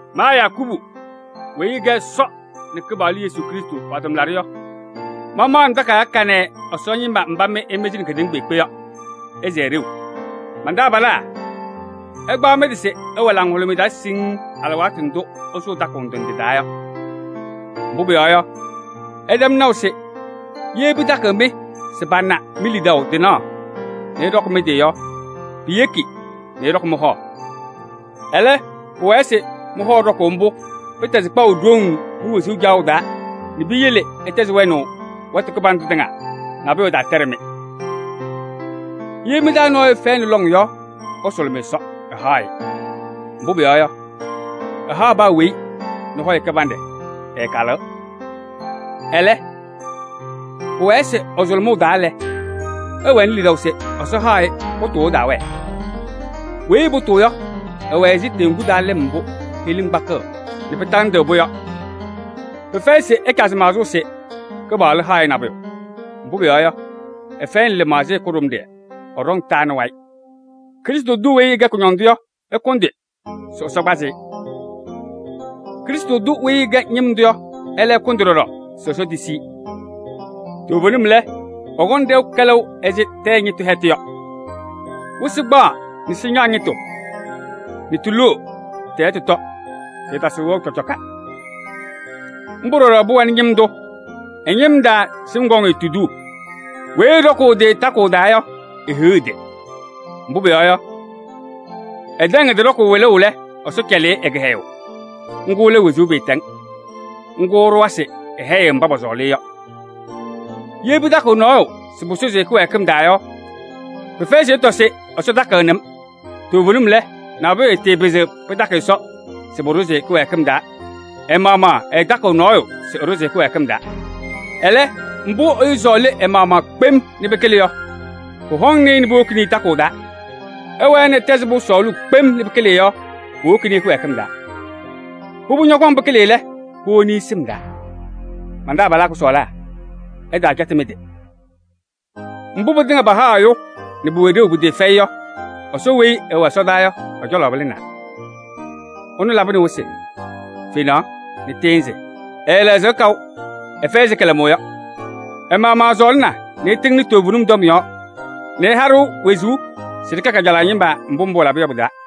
Ma Yakubu weyi ɛkɛ Ɛsɔ nɛ Kɩpaɣlʋ Yesu Krɩstʋ pa-tʋmlaɖʋ yɔ, mamaɣnɩ takayaɣ kanɛ Ɛsɔ ñɩma mbá mɩ ɩmɩzɩnɩ kedeŋa kpeekpe yɔɔ yɔ. Ɩsɛɛ ɖeu! Man-taabalaa! Ɩkpaɣ mɩ-tɩ se ɩwɛ laŋhʋlʋmɩyɛ taa siŋŋ alɩwaatʋ ndʋ́ ɩsʋʋ takʋʋ ndɩ ndɩ taa yɔ. Mbʋ́ pʋyɔɔ yɔ, ɩtɛm naʋ se yee pɩtakɩɣ-mɩ se pana mi-lidaʋ tɩnaɣ nɛ ɩɖɔkɩ mɩ-tɩ yɔ, piyeki nɛ ɩɖɔkɩ mɩ-hɔ. Ɛlɛ́, pʋwɛɛ se mɩ-hɔ ɖɔkʋʋ ḿbʋ́, pɩtɛzɩ kpaʋ ɖoŋ mi-wezuu caɣʋ taa nɛ piyele ɩtɛzɩ wɛnaʋ wɛtʋ kɩbandʋ tɩŋa, nabʋyʋ ɛtaatɛɖɩ-mɩ. Yee mɩ-taa nɔɔyʋ ɛfɛyɩnɩ lɔŋ yɔ, ɛsʋlʋmɩ Ɛsɔ, ɛhaɣ-ɩ. Mbʋ́ pʋyɔɔ yɔ, ɛhaɣ paa weyi nɛ laŋɩyɛ kɩbanɖɛ, ɛɛkalɩɣ. Ɛlɛ́, pʋwɛɛ se ɛ-sʋlʋmʋʋ taa lɛ, ɛwɛnɩ lidaʋ se Ɛsɔ haɣ-ɩ, pʋtʋʋ ɛtaawɛɛ. Weyi ɛpʋtʋʋ yɔ, ɛwɛ ɛzɩ teŋgu taa lɩm mbʋ́ heɣlim kpakɩɣ nɛ pɩtaŋgatɩɣ-pʋ yɔ. Pɩfɛyɩ se ɛcazɩ maɣzʋʋ se Kɩpaɣlʋ haɣ-ɩ nabʋyʋ. Mbʋ́ pʋyɔɔ yɔ, ɛfɛyɩnɩ lɩmaɣzɩyɛ kʋɖʋmɖɩyɛ, ɛɖɔŋ taa nɛ wayɩ. Krɩstʋ tʋ weyi ɛkɛ kʋñɔndʋ yɔ, ɛkʋndɩ se Ɛsɔ kpazɩ-ɩ. Krɩstʋ tʋ weyi ɛkɛ ñɩm tʋ yɔ, ɛ́lɛ́ ɛkʋndɩ ɖɔɖɔ se Ɛsɔ tisi-i. Toovenim lɛ, ɛkɔŋ ɖɛʋ kɛlɛʋ ɛzɩ tɛyɛ ñɩtʋ hɛtʋ yɔ. Wɩsɩ kpaɣ nɛ sɩñaɣ ñɩtʋ nɛ tiloo nɛ tɩ-hɛtʋ tɔ, tɩɩtasɩɣ wɛʋ ɖeu. Ḿbʋ́ ɖɔɖɔ pʋwɛnɩ ñɩm tʋ. Ɛ-ñɩm taa sɩm kɔŋ-ɩ tuduu. Weyi ɛɖɔkʋʋ ɛ-tɩ takʋʋ taa yɔ, ehiɣ ɛ-tɩ! Mbʋ́ pʋyɔɔ yɔ, ɛtɛŋ wɩlʋʋ ɛ-tɩ ɖɔkʋʋ lɛ, Ɛsɔ cɛlɩ-ɩ ɛ-kɩhɛyʋʋ: ŋ́gʋ́ lɛ wezuu maatɛŋ. Ŋ́gʋ́ ɛɖʋwa se ɛhɛyɩɣ mbá pɔsɔɔlɩ-ɩ yɔ. Yee pɩtakɩɣ nɔɔyʋ se pʋsʋzɩ-ɩ kɩwɛɛkɩm taa yɔ, pɩfɛyɩ se ɛtɔ se: “Ɛsɔ takɩɣnɩ-m.” Toovenim lɛ, nabʋyʋ ɛɛtɩɩpɩzɩɣ pɩtakɩ Ɛsɔ se pʋɖʋzɩ-ɩ kɩwɛɛkɩm taa, ɛ-maɣmaɣ ɛɛtakɩɣ nɔɔyʋ se ɛɖʋzɩ-ɩ kɩwɛɛkɩm taa. Ɛlɛ́, mbʋ́ ɛyʋ sɔɔlɩ ɛ-maɣmaɣ kpem nɛ pɩkɩlɩ yɔ, ḿbʋ́ hɔŋnɩ-ɩ nɛ puwokini-i takʋʋ taa. Ɛwɛɛ nɛ ɛtɛzɩɣ-pʋ sɔɔlʋʋ kpem nɛ pɩkɩlɩɣ yɔ, puwokini-i kɩwɛɛkɩm taa. Pʋbʋ ñɔkɔŋ pɩkɩlɩ-ɩ lɛ, puwoni-i sɩm taa. Man-taabalaa kʋsɔɔlaa! Ɩtaacɛtɩ mɩ-tɩ. Mbʋ́ pɩtɩŋa pahaɣ ɛyʋ nɛ pʋwɛ ɖeu pɩtɩɩfɛyɩ yɔ, Ɛsɔ weyi ɛwɛ ɛsɔdaa yɔ ɛ-cɔlɔ pɩlɩnaa. Ɛnʋ labɩnɩ wɩsɩ nɛ fenaɣ nɛ tɩɩnzɩ. Ɛɛlɛɣzɩɣ kaʋ: ɛfɛyɩ ɛzɩ kɩlɛmʋʋ yɔ. Ɛ-maɣmaɣ ɛsɔɔlɩna nɛ ɛtɩŋnɩ toovenim tɔm yɔɔ nɛ ɛha-ɖʋ wezuu se ɖɩkɛ kajalaɣ ñɩma, mbʋ́ mbʋ́ ɛlaba yɔ pɩ-taa.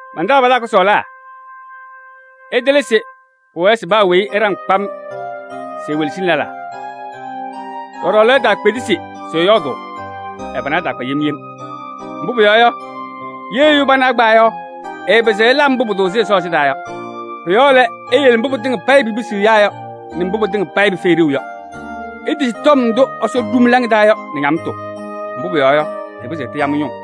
Man-taabalaa kʋsɔɔlaa! Ɩtɩlɩ se: pʋwɛɛ se paa weyi ɛɖaŋ kpam nɛ ewelesini lɛlaa. Đɔɖɔ lɛ, ɛtaakpedesi se ɛyɔɔdʋʋ, ɛ-pana ɛtaakpa yem yem. Mbʋ́ pʋyɔɔ yɔ, yee ɛyʋ pana ɛkpawa yɔ, ɛɛpɩzɩɣ ɛla mbʋ́ pʋtʋʋzɩ Ɛsɔ ɛsɩndaa yɔ. Pʋ-yɔɔ lɛ, iyele mbʋ́ pɩtɩŋa payɩ pipisiɣ ɛyáa yɔ nɛ mbʋ́ pɩtɩŋa payɩ pɩfɛyɩ ɖeu yɔ. Itisi tɔm ndʋ́ Ɛsɔ ɖu mɩ-laŋa taa yɔ nɛ ñamtʋ, mbʋ́ pʋyɔɔ yɔ, tɩpɩzɩɣ tɩya mɩ-ñʋʋ.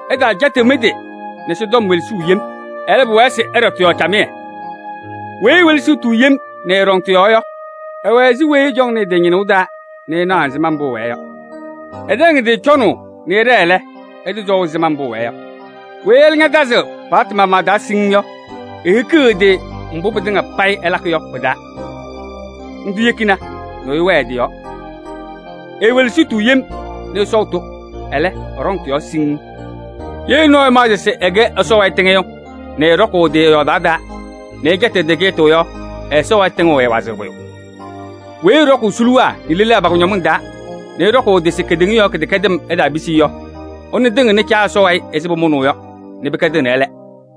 Ɩtaacɛtɩɣ mɩ-tɩ nɛ Ɛsɔtɔm welesuu yem. Ɛlɛ́, pʋwɛɛ se ɩɖɔ tɩ-yɔɔ camɩyɛ. Weyi ewelesiɣ-tʋ yem nɛ ɛɛɖɔŋ tɩ-yɔɔ yɔ, ɛwɛ ɛzɩ weyi ɛcɔŋnɩ ɛ-tɩ ñɩnʋʋ taa nɛ ɛnaɣ ɛzɩma mbʋ́ ɛwɛɛ yɔ. Ɛtɛm ɛ-tɩ cɔnaʋ nɛ ɛɖɛɛ lɛ, ɛsɔɔ ɛzɩma ɛwɛɛ yɔ kpaagbaa. Weyi ɛ́lɛ́ ñatazɩɣ paɣtʋ maɣmaɣ taa siŋŋ yɔ, ehikiɣ ɛ-tɩ mbʋ́ pɩtɩŋa payɩ ɛlakɩ yɔ pɩ-taa. Ńdʋ́ yekina nɛ ɛyʋ wɛɛ ɛ-tɩ yɔɔ. Eewelesiɣ-tʋ yem nɛ ɛsɔɔ-tʋ, ɛlɛ́, ɛɖɔŋ tɩ-yɔɔ siŋŋ. Yee nɔɔyʋ ɛmaɣzɩɣ se ɛkɛ Ɛsɔ wayɩ tɩŋɩyʋ nɛ ɛɛɖɔkʋʋ ɛ-tɩ ɛ-yɔɔdaɣ taa nɛ ɛcɛtɩɣ ɛ-tɩ kɩcɛtʋ yɔ, ɛ-Ɛsɔ wayɩ tɩŋʋʋ ɛɛwazɩɣ pʋyʋ. Weyi ɛɖɔkʋʋ suluwaa nɛ lelaa pa-kʋñɔmɩŋ taa nɛ ɛɖɔkʋʋ ɛ-tɩ se kedeŋa yɔɔ kɩdɛkɛdɩm ɛtaapisi-i yɔ, ɛnʋ tɩŋɩɣnɩ Caa Ɛsɔ wayɩ ɛzɩ pʋmʋnaʋ yɔ nɛ pɩkɛdɩɣnɩ ɛ́lɛ́.